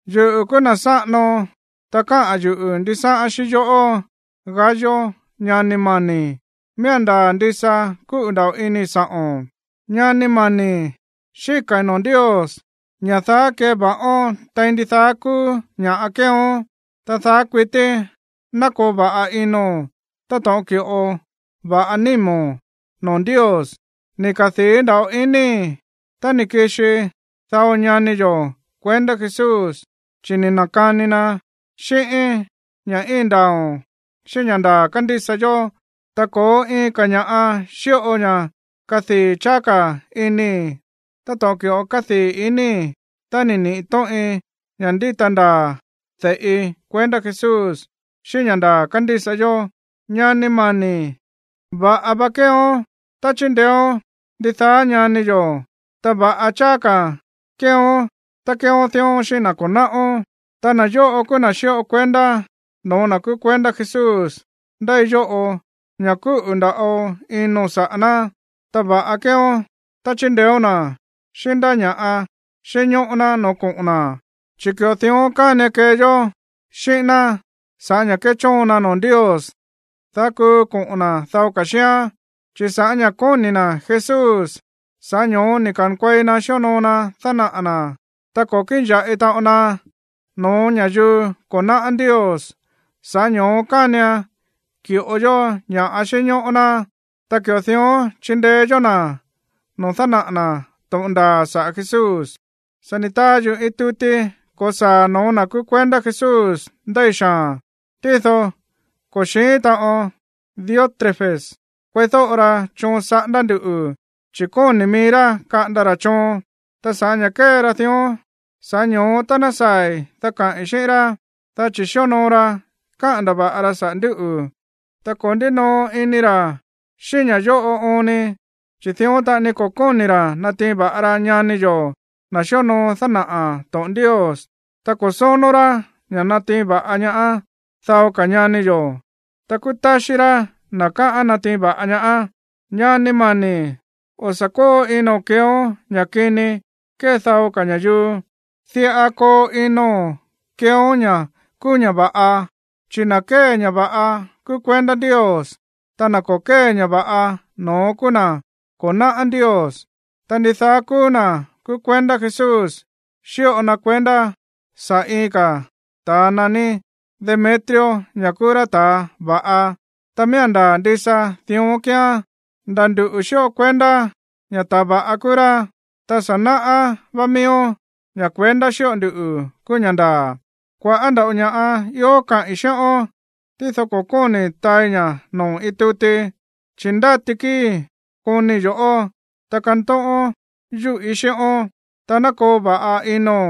Yuꞌu̱ kúú na̱ sáꞌano, ta káꞌa̱n yuꞌu̱ ndisáꞌán xíꞌín yoꞌó, Gayo, ñani mani̱. Miía̱n ndaa̱ ndisa kúꞌu̱ nda̱ꞌo inii̱ sa̱ꞌo̱n. Ñani mani̱, xíka̱i̱ noo̱ Ndios ña̱ daá keva̱ꞌón tein ndidaá kúú ña̱ꞌa kéeón, ta daá kuití ná koo va̱ꞌa ino̱n táto̱ꞌon ki̱ꞌo va̱ꞌa nímo̱n noo̱ Ndios. Ni̱ kadii̱ nda̱ꞌo inii̱ tá ni̱ kixi dao ñani yo̱ kuendá Jesús, chi̱ ni̱ na̱kani na xíꞌíín ña̱ íin ndaa̱o̱n xíꞌín ña̱ ndaa̱ kándísa yó. Ta ko̱ó iin ka̱ ña̱ꞌa xíꞌo ña̱ kádii̱ cháá ka̱ inii̱ táto̱ꞌon ki̱ꞌo kádii̱ inii̱ tá níꞌi̱ to̱ꞌin ña̱ ndíta ndaa̱ de̱ꞌi kuendá Jesús xíꞌín ña̱ ndaa̱ kándísa yó. Ñani mani̱, va̱ꞌa va kéeón tá chíndeéón ndidaá ñani yo̱, ta va̱ꞌa cháá ka̱ kéeón tá kéeón dión xíꞌín na̱ ko̱ náꞌón. Ta na̱ yóꞌo kúú na̱ xíꞌo kuendá noo̱ na̱ kúú kuendá Jesús ndéi yóꞌo ña̱ kúꞌu̱ nda̱ꞌo ino̱n saꞌa̱ ná. Ta va̱ꞌa keeón tá chindeéón na̱ xíꞌín ndá ña̱ꞌa xínñóꞌó ná noo̱ koꞌo̱n na̱, chi̱ ki̱ꞌo dión kánian kee yó xíꞌín ná saꞌa̱ ña̱ kéchóon na noo̱ Ndios, dá kuu koꞌo̱n na̱ dao ka̱ xíán. Chi̱ sa̱ꞌá ña̱ kóni̱ na̱ Jesús, sa̱ꞌá ño̱ó ni̱ ka̱nkuei na xíonoo na dánaꞌa̱ na̱, ta ko̱ kíꞌin ya̱ꞌi taꞌon na no̱ó ña̱yuu ko̱ náꞌá Ndios. Sa̱ꞌá ño̱ó kánian ki̱ꞌo yó ña̱ꞌa xínñóꞌó ná, ta ki̱ꞌo dión chíndeé yó na̱ noo̱ dánaꞌa̱ na̱ to̱ꞌon ndaa̱ saꞌa̱ Jesús. Sa̱ ni̱ taa yuꞌu̱ iin tuti ko̱saa̱ no̱ó na̱ kúú kuendá Jesús ndéi xaa̱n, tído ko̱ xi̱ín taꞌon Diótrefes kueídóꞌo ra choon saꞌándá ndu̱, chi̱ kóni̱ mií rá kaꞌanda ra̱ choon. Ta sa̱ꞌá ña̱ kée ra dión, sa̱ꞌá ño̱ó tá ná saa̱i̱, dá kaꞌi̱n xíꞌín rá, dá chi̱ xíonoo ra káꞌa̱n ndava̱ꞌa ra saꞌa̱ ndúꞌu̱. Ta ko̱ ndínoo ini ra̱ xíꞌín ña̱ yóꞌo oon ni, chi̱ dión taꞌani ko̱ kóni̱ ra̱ natiin va̱ꞌa ra ñani yo̱, na̱ xíonoo dánaꞌa̱ to̱ꞌon Ndios. Ta ko̱ sónó rá ña̱ natiin va̱ꞌa ñaá dao ka̱ ñani yo̱. Ta kúú táxí rá na̱ káꞌán natiin va̱ꞌa ñaá. Ñani mani̱, o̱ sa̱ kóo ino̱n keeón ña̱ kini kée dao ka̱ ña̱yuu. Diꞌa koo ino̱n keeón ña̱ kúú ña̱ va̱ꞌa. Chi̱ na̱ kée ña̱ va̱ꞌa kúú kuendá Ndios, ta na̱ ko̱ kée ña̱ va̱ꞌa, no̱ón kúú na̱ ko̱ náꞌá Ndios. Ta ndidaá kúú na̱ kúú kuendá Jesús xíꞌo na kuendá saꞌa̱ iin ka̱ ta̱a naní Demetrio ña̱ kúú rá ta̱a va̱ꞌa, ta miía̱n ndaa̱ ndisa dión kíán. Nda̱ nduꞌu̱ xíꞌo kuendá ña̱ ta̱ va̱ꞌa kúú rá, ta sa̱ náꞌá vá miíón ña̱ kuendá xíꞌo nduꞌu̱ kúú ña̱ ndaa̱. Kua̱ꞌá nda̱ꞌo ña̱ꞌa ió kaꞌi̱n xíꞌón, tído ko̱ kóni̱ taai ña̱ noo̱ iin tuti, chi̱ ndáti kíi̱i̱ konii̱ yo̱ꞌó, ta kantóꞌón yúꞌí xíꞌón. Ta ná koo va̱ꞌa ino̱n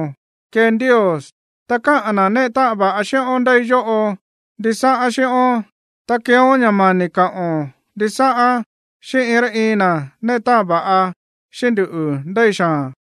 kee Ndios. Ta káꞌa̱n na̱ néꞌe táꞌan va̱ꞌa xíꞌón ndéi yóꞌo ndisáꞌán xíꞌón. Ta keeón ña̱ mani̱ kaꞌo̱n ndisáꞌán xíꞌín iin rá iin na̱ néꞌe táꞌan va̱ꞌa xíꞌín nduꞌu̱ ndéi xaa̱n.